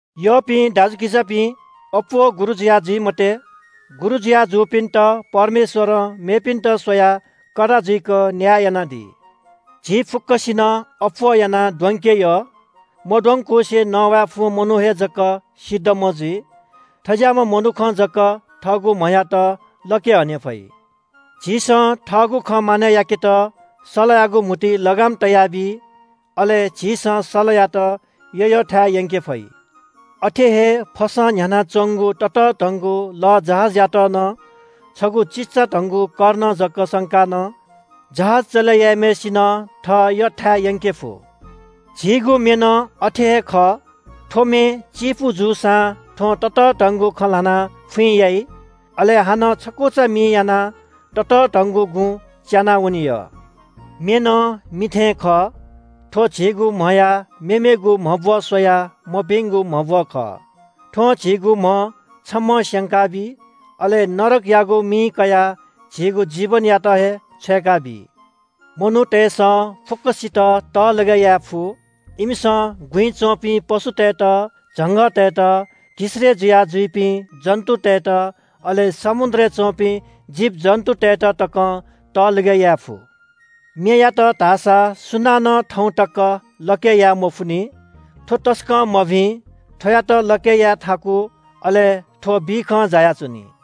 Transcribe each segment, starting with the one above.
यःपिं दाजुकिजापिं, अप्‍वः गुरु जुयाः जुइ मते। गुरु जुया जूपिन्‍त परमेश्‍वरं मेपिन्‍त स्‍वयाः कडा जुइक न्‍याय यानादी। झी फुक्‍कसिनं अप्‍वः यानाः द्वंके यः। मद्वंकुसे नवाये फुम्‍ह मनू हे जक सिद्धम्‍ह जुइ। थज्‍याःम्‍ह मनुखं जक थःगु म्‍हयात लके हने फइ। झीसं थःगु खँ मानय् याकेत सलयागु म्‍हुतुइ लगाम तयाबी, अले झीसं सलयात यःयःथाय् यंके फइ। अथे हे फसं न्‍ह्यानाच्‍वंगु ततःधंगु लःजहाजयात नं छगू चिचाधंगु कर्ण जक संकाः नं जहाज चले याइम्‍हय्‌सिनं थः यःथाय् यंके फु। झीगु मे नं अथे हे खः। थ्‍व मे चिपु जूसां थ्‍वं ततःधंगु खँ ल्‍हानाः फुइँ याइ। अले हानं छकुचा मिं यानाः ततःधंगु गुँ च्‍यानाः वने यः। मे नं मि थें खः। थ्‍व झीगु म्‍हया मेमेगु म्‍हब्‍व स्‍वयाः मभिंगु म्‍हब्‍व खः। थ्‍वं झीगु म्‍ह छम्‍हं स्‍यंकाबी। अले नरकयागु मि कयाः झीगु जीवनयात हे छ्वय्‌काबी। मनूतय्‌सं फुक्‍कसित तहलगय् याये फु। इमिसं गुँइ च्‍वंपिं पशुतय्‌त, झंगःतय्‌त, घिसय्‌ जुया जुइपिं जन्‍तुतय्‌त, अले समुद्रय् च्‍वंपिं जीवजन्‍तुतय्‌त तकं तहलगय् याये फु। मेयात धाःसा सुनानं थौं तक लके याये मफुनि। थ्‍व तसकं मभिं, थ्‍वयात लके याये थाकु, अले थ्‍व बिखं जायाच्‍वनी।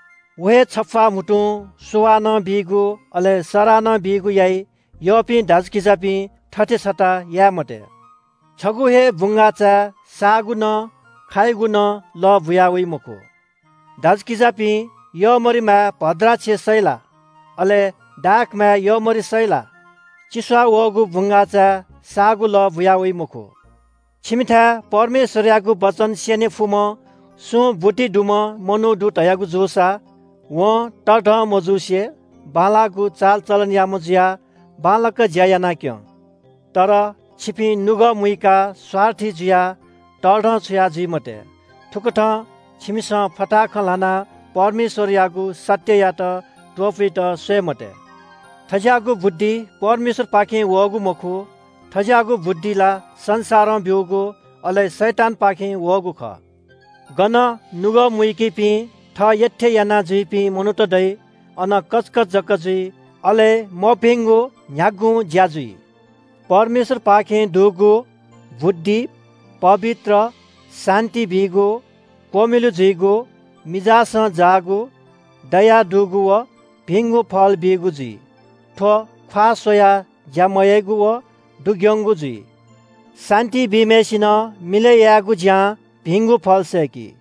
व हे छप्‍वाः म्‍हुतुं सुवाः नं बीगु, अले सराः नं बीगु याइ। यःपिं दाजुकिजापिं, थथे छता याये मते। छगू हे बुंगाःचाय् साःगु नं खायुगु नं लः बुया वइ मखु। दाजुकिजापिं, यःमरिमाय् भद्राक्ष सइ ला? अले दाखमाय् यःमरि सइ ला? चि सवाः वःगु बुंगाःचाय् साःगु लः बुया वइ मखु। छिमिथाय् परमेश्‍वरयागु वचन स्‍यने फुम्‍ह सुं बुद्धि दुम्‍ह मनू दु धयागु जूसा वं तःधं मजुसे बांलाःगु चालचलनयाम्‍ह जुयाः बांलाक ज्‍या यानाः क्‍यँ। तर छिपिं नुगः मुइकाः स्‍वार्थी जुयाः तःधंछुया जुइ मते। थुकथं छिमिसं फताहा खँ ल्‍हानाः परमेश्‍वरयागु सत्‍ययात त्‍वपुइत स्‍वये मते। थज्‍याःगु बुद्धि परमेश्‍वरपाखें वःगु मखु। थज्‍याःगु बुद्धि ला संसारं ब्‍यूगु, अले शैतानपाखें वःगु खः। गन नुगः मुइकीपिं थः यःथें यानाजुइपिं मनूत दइ, अन कचकच जक जुइ, अले मभिंगु न्‍ह्यागुं ज्‍या जुइ। परमेश्‍वरपाखें दुगु बुद्धि पवित्र, शान्‍ति बीगु, क्‍वमिलु जुइगु, मिजासं जाःगु, दया दुगु व भिंगु फल बीगु जुइ। थ्‍व ख्‍वाः स्‍वयाः ज्‍या मयाइगु व दुग्‍यंगु जुइ। शान्‍ति बीम्‍हय्‌सिनं मिलय् यायेगु ज्‍यां भिंगु फल सय्‌की।